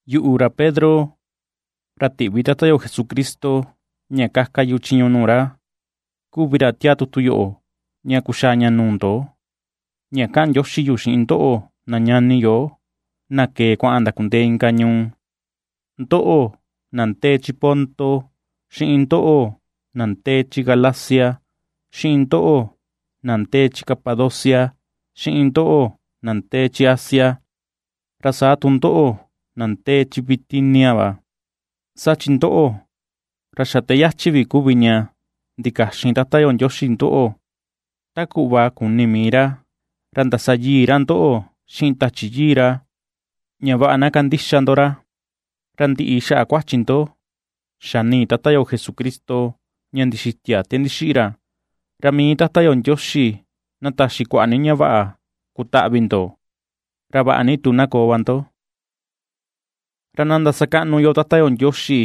Yuꞌu, ra Pedro, ra tiꞌvi Tata yo Jesucristo ña kaka yu chiñu nuu ra kuvi ra, tiaa tutu yoꞌo ña kuxaa ña nuu ndo ña kaꞌan ndioxi yu xiꞌin ndoꞌo, na ñani yo na kee kuaꞌan ndakundee inka ñuu, ndoꞌo na ndee chi Ponto, xiꞌin ndoꞌo na ndee chi Galacia, xiꞌin ndoꞌo na ndee chi Capadocia, xiꞌin ndoꞌo na ndee chi Asia, ra saa tu ndoꞌo na ndee chi Bitinia va. Saa chi ndoꞌo, ra xa te yachi vi kuvi ña ndikaxin Tata yo Ndioxi ndoꞌo, ta kuꞌva kuni mii ra. Ra ndasa yii ra ndoꞌo xiꞌin Tachi Yii ra, ña vaꞌa na kandixa ndo ra, ra ndiꞌi xaꞌa kuachi ndo xaꞌa nii Tata yo Jesucristo ña ndixitia te ndixiꞌi ra. Ra mii Tata yo Ndioxi na taxi kuaꞌa ni ña vaꞌa kutaꞌvi ndo, ra vaꞌa ni tu na koo va ndo. Ra na ndasakaꞌnu yo Tata yo Ndioxi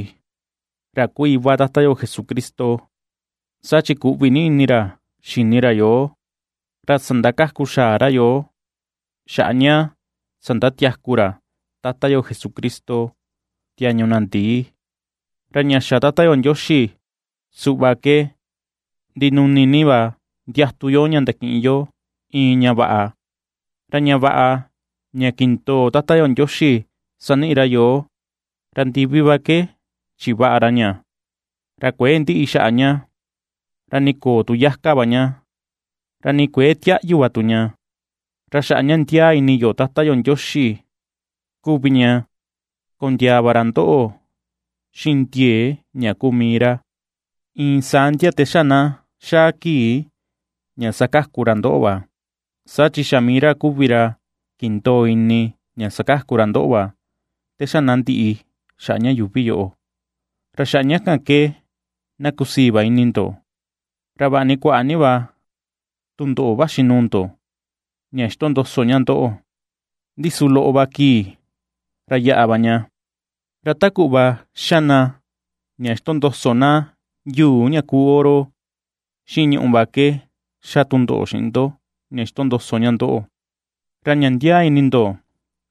ra kuu iva Tata yo Jesucristo, saa chi kuꞌvi ni ini ra xini ra yoo, ra sandakaku xaa ra yoo, xaꞌa ña sandatiaku ra Tata yo Jesucristo tiañu na ndii. Ra ña xa Tata yo Ndioxi suꞌva ke ndinuni ni va ndiatu yo ña ndakiꞌin yo iin ña vaꞌa. Ra ña vaꞌa ña kindoo Tata yo Ndioxi saniꞌi ra yoo, ra ndivi va ke chivaꞌa ra ña, ra kuëe ndiꞌi xaꞌa ña, ra ni köo tu yakua va ña, ra ni kuëe tiaꞌyu va tu ña. Ra xaꞌa ña ndiaa ini ndo Tata yo Ndioxi kuvi ña kondiaa va ra ndoꞌo xiꞌin ndiee ña kuu mii ra, iin saa ndia te xa na xaa kii ña sakaku ra ndoꞌo va, saa chi xa mii ra kuvi ra kindoo ini ña sakaku ra ndoꞌo va te xa na ndiꞌi xaꞌa ña yuuvi yoꞌo. Ra xaꞌa ña kan ke na kusii va ini ndo. Ra vaꞌa ni kuaꞌa ni va tundoꞌo vaxi nuu ndo ña xitondoso ña ndoꞌo, ndi su loꞌo va kii ra yaꞌa va ña. Ra ta kuꞌva xa na ña xitondoso na yuu ña kuu oro xiꞌin ñùꞌù va ke xa tundoꞌo xiꞌin ndo ña xitondoso ña ndoꞌo, ra ña ndiaa ini ndo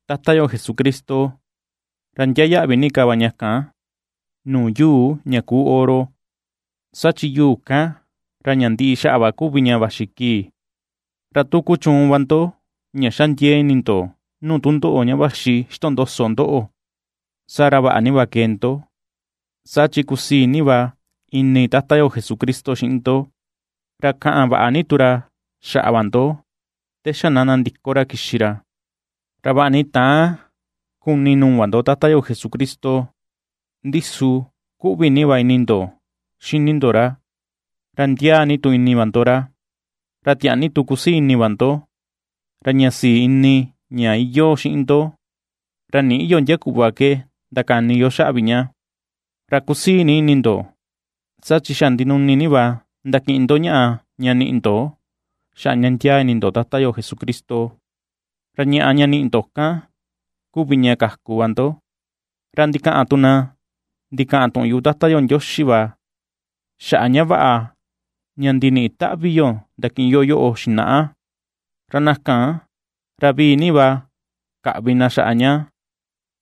Tata yo Jesucristo ra ndiaa yaꞌvi ni ka va ña kan nuu yuu ña kuu oro, saa chi yuu kan ra ña ndiꞌi xaꞌa va kuvi ña vaxi kii. Ra tu kuchuun va ndo ña xa ndiee ini ndo nuu tundoꞌo ña vaxi xitondoso ndoꞌo, saa ra vaꞌa ni va kee ndo, saa chi kusii ni va ini Tata yo Jesucristo xiꞌin ndo, ra kaꞌan vaꞌa ni tu ra xaꞌa va ndo te xa na nandiko ra kixi ra. Ra vaꞌa ni täan kuni nuu va ndo Tata yo Jesucristo, ndi su kuꞌvi ni va ini ndo xini ndo ra. Ra ndiaa ni tu ini va ndo ra, ra tiaa ni tu kusii ini va ndo, ra ña sii ini ña iyoo xiꞌin ndo ra nïꞌi yo ndia kuꞌva ke ndakani yo xaꞌa vi ña. Ra kusii ni ini ndo, saa chi xa ndinumi ni va ndakiꞌin ndo ñaꞌa ña niꞌi ndo xaꞌa ña ndiaa ini ndo Tata yo Jesucristo; ra ñaꞌa ña niꞌi ndo kan kuvi ña kaku va ndo. Ra ndikaꞌan tu na ndikaꞌan tuꞌun yuꞌu Tata yo Ndioxi va xaꞌa ña vaꞌa ña ndiniꞌi taꞌvi yo ndakiꞌin yo yoꞌo xinaꞌa, ra na kan ra vii ni va kaꞌvi na xaꞌa ña,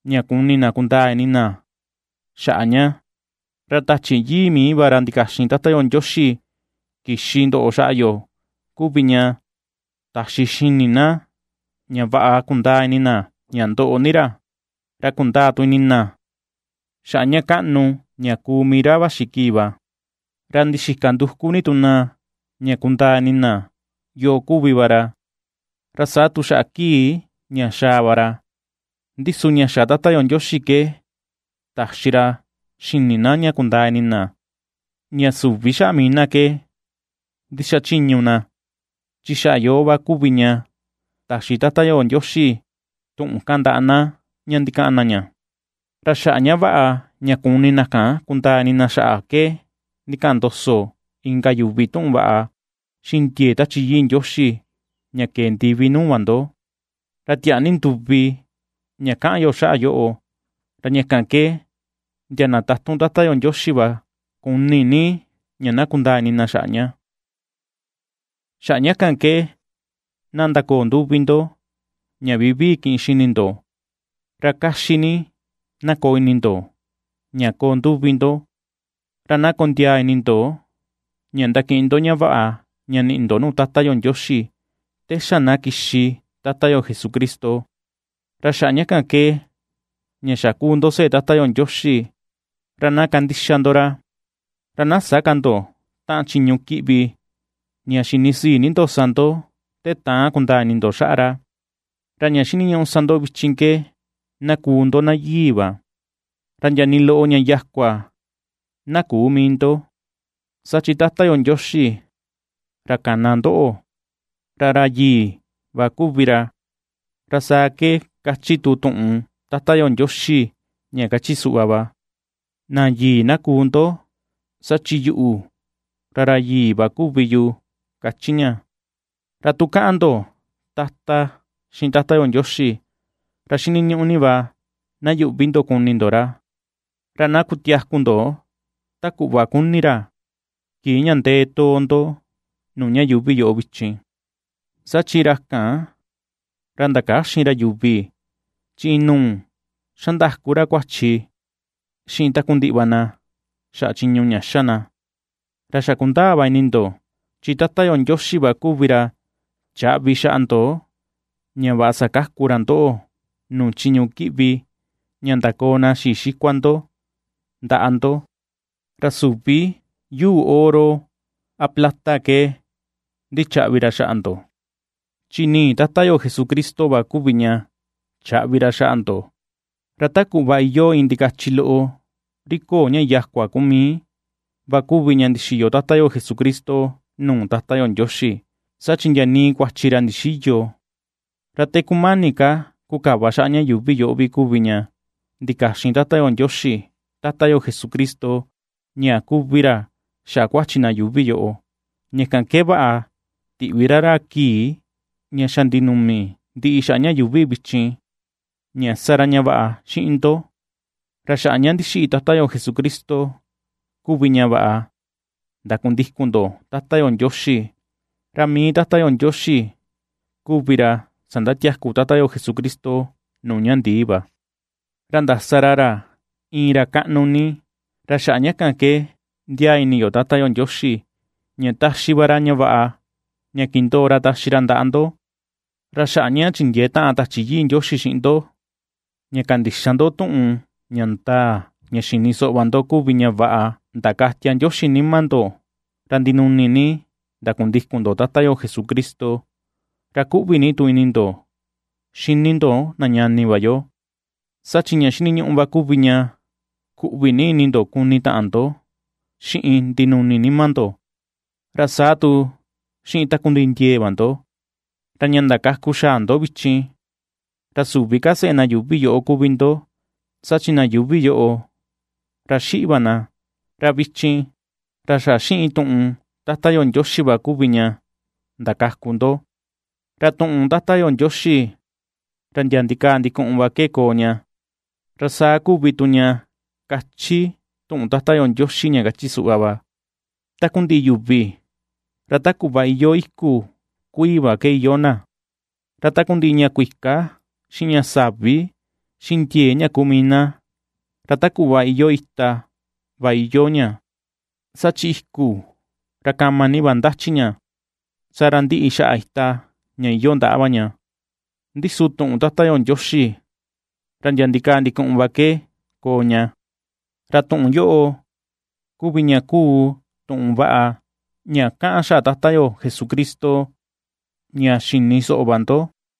ña kuni na kundaa ni ka ini na xaꞌa ña. Ra Tachi Yii mii va ra ndikaxin Tata yo Ndioxi kixi ndoꞌo xaꞌa yo kuvi ña taxi xini na ña vaꞌa kundaa ini na ña ndoꞌo ni ra, ra kundaa tu ini na xaꞌa ña kaꞌnu ña kuu mii ra vaxi kii va; ra ndixika nduku ni tu na ña kundaa ini na yoo kuvi va ra, ra saa tu xaꞌa kii ña xaa va ra. Ndi su ña xa Tata yo Ndioxi ke taxi ra xini na ña kundaa ini na ña süvi xaꞌa mii na ke ndixachiñu na, chi xaꞌa yoo va kuvi ña taxi Tata yo Ndioxi tuꞌun kan ndaꞌa na ña ndikaꞌan na ña. Ra xaꞌa ña vaꞌa ña kuni na kan kundaa ini na xaꞌa ke ndikaꞌan ndoso inka yuvi tuꞌun vaꞌa xiꞌin ndiee Tachi Yii Ndioxi ña kee ndivi nuu va ndo. Ra tiaa ni nduvi ña kaꞌan yo xaꞌa yoꞌo, ra ña kan ke ndia na tatun Tata yo Ndioxi va kuni ni ña kundaa ini na xaꞌa ña. Xaꞌa ña kan, na ndakoo nduvi ndo ña vivii kiꞌin xini ndo, ra kaxi ni na koo ini ndo ña koo nduvi ndo, ra na kondiaa ini ndo ña ndakiꞌin ndo ña vaꞌa ña niꞌi ndo nuu Tata yo Ndioxi te xa na kixi Tata yo Jesucristo. Ra xaꞌa ña kan ke, ña xa kuu ndo seꞌe Tata yo Ndioxi ra na kandixa ndo ra, ra na sä ka ndo taꞌan chiñu kiꞌvi ña xinisii ni ndo sa ndo te täan kundaa ini ndo xaꞌa ra. Ra ña xiniñuꞌu sa ndo vichin ke na kuu ndo na yii va, ra ndia nii loꞌo ña yakua na küu mii ndo, saa chi Tata yo Ndioxi ra kana ndoꞌo, ra ra yii va kuvi ra; Ra saa ke ^kachi tu tuꞌun Tata yo Ndioxi ña kachi suꞌva va: “Na yii na kuu ndo, saa chi yuꞌu ra ra yii va kuvi yu”, kachi ña. Ra tu kaꞌan ndo “Tata” xiꞌin Tata yo Ndioxi, ra xiniñuꞌu ni va na yuꞌvi ndo kuni ndo ra, ra na kutiaku ndo ta kuꞌva kuni ra, kii ña ndee too ndo nuu ña yuuvi yoꞌo vichin, saa chi ra kan, ra ndakäxin ra yuvi chi inuu xandaku ra kuachi xiꞌin takundiꞌi va na xaꞌa chiñu ña xa na. Ra xa kundaa va ini ndo, chi Tata yo Ndioxi va kuvi ra chaꞌvi xaꞌa ndo ña vaꞌa sakaku ra ndoꞌo nuu chiñu kiꞌvi ña ndakoo na xii xikua ndo ndaꞌa ndo; ra süvi yuu oro a plata ke ndichaꞌvi ra xaꞌa ndo, chi nii Tata yo Jesucristo va kuvi ña chaꞌvi ra xaꞌa ndo, ra ta kuꞌva iyoo iin ndikachi loꞌo ri köo ña yakua kuu mii va kuvi ña ndixiyo Tata yo Jesucristo nuu Tata yo Ndioxi, saa chi ndia nii kuachi ra ndixïyo. Ra te kumani ka kukava xaꞌa ña yuuvi yoꞌo vi kuvi ña ndikaxin Tata yo Ndioxi Tata yo Jesucristo ña kuvi ra xaꞌa kuachi na yuuvi yoꞌo; ña kan ke vaꞌa tiꞌvi ra ra kii ña xa ndinumi ndiꞌi xaꞌa ña yuuvi vichin ña sa ra ña vaꞌa xiꞌin ndo. Ra xaꞌa ña ndixiꞌi Tata yo Jesucristo kuvi ña vaꞌa ndakundikun ndo Tata yo Ndioxi, ra mii Tata yo Ndioxi kuvi ra sandatiaku Tata yo Jesucristo nuu ña ndii va, ra ndasa ra ra iin ra kaꞌnu ni; ra xaꞌa ña kan ke ^ndiaa ini ndo Tata yo Ndioxi ña taxi va ra ñaꞌa ña kindoo ra taxi ra ndaꞌa ndo. Ra xaꞌa ña chindiee taꞌan Tachi Yii Ndioxi xiꞌin ndo ña kandixa ndo tuꞌun ña ndaa ña xini soꞌo va ndo kuvi ña vaꞌa ndakatia Ndioxi nima ndo, ra ndinuni ni ndakundikun ndo Tata yo Jesucristo, ra kuꞌvi ni tu ini ndo xini ndo na ñani va yo. Saa chi ña xiniñuꞌu va kuvi ña kuꞌvi ni ini ndo kuni taꞌan ndo xiꞌin ndinuni nima ndo, ra saa tu xiꞌin takundiꞌi ndiee va ndo. Ra ña ndakaku xaa ndo vichin, ra süvi ka seꞌe na yuuvi yoꞌo kuvi ndo, saa chi na yuuvi yoꞌo ra xiꞌi va na, ra vichin ra xa xiꞌin tuꞌun Tata Ndioxi va kuvi ña ndakaku ndo, ra tuꞌun Tata yo Ndioxi ra ndia ndikaa ndikuꞌun va ke koo ña. Ra saa kuvi tu ña kachi tuꞌun Tata yo Ndioxi ña kachi suꞌva va: Takundiꞌi yuvi ra ta kuꞌva iyoo iku kuii va ke iyoo na, ra takundiꞌi ña kuika xiꞌin ña savi, xiꞌin ndiee ña kuu mii na ra ta kuꞌva iyoo ita va iyo ña. Saa chi iku, ra kama ni va ndachi ña, saa ra ndiꞌi tu xaꞌa ita ña iyoo ndaꞌa va ña. Ndi su tuꞌun Tata yo Ndioxi ra ndia ndikaa ndikuꞌun va ke koo ña. Ra tuꞌun yoꞌo kuvi ña kuu tuꞌun vaꞌa ña kaꞌan xaꞌa Tata yo Jesucristo ña xini soꞌo va ndo.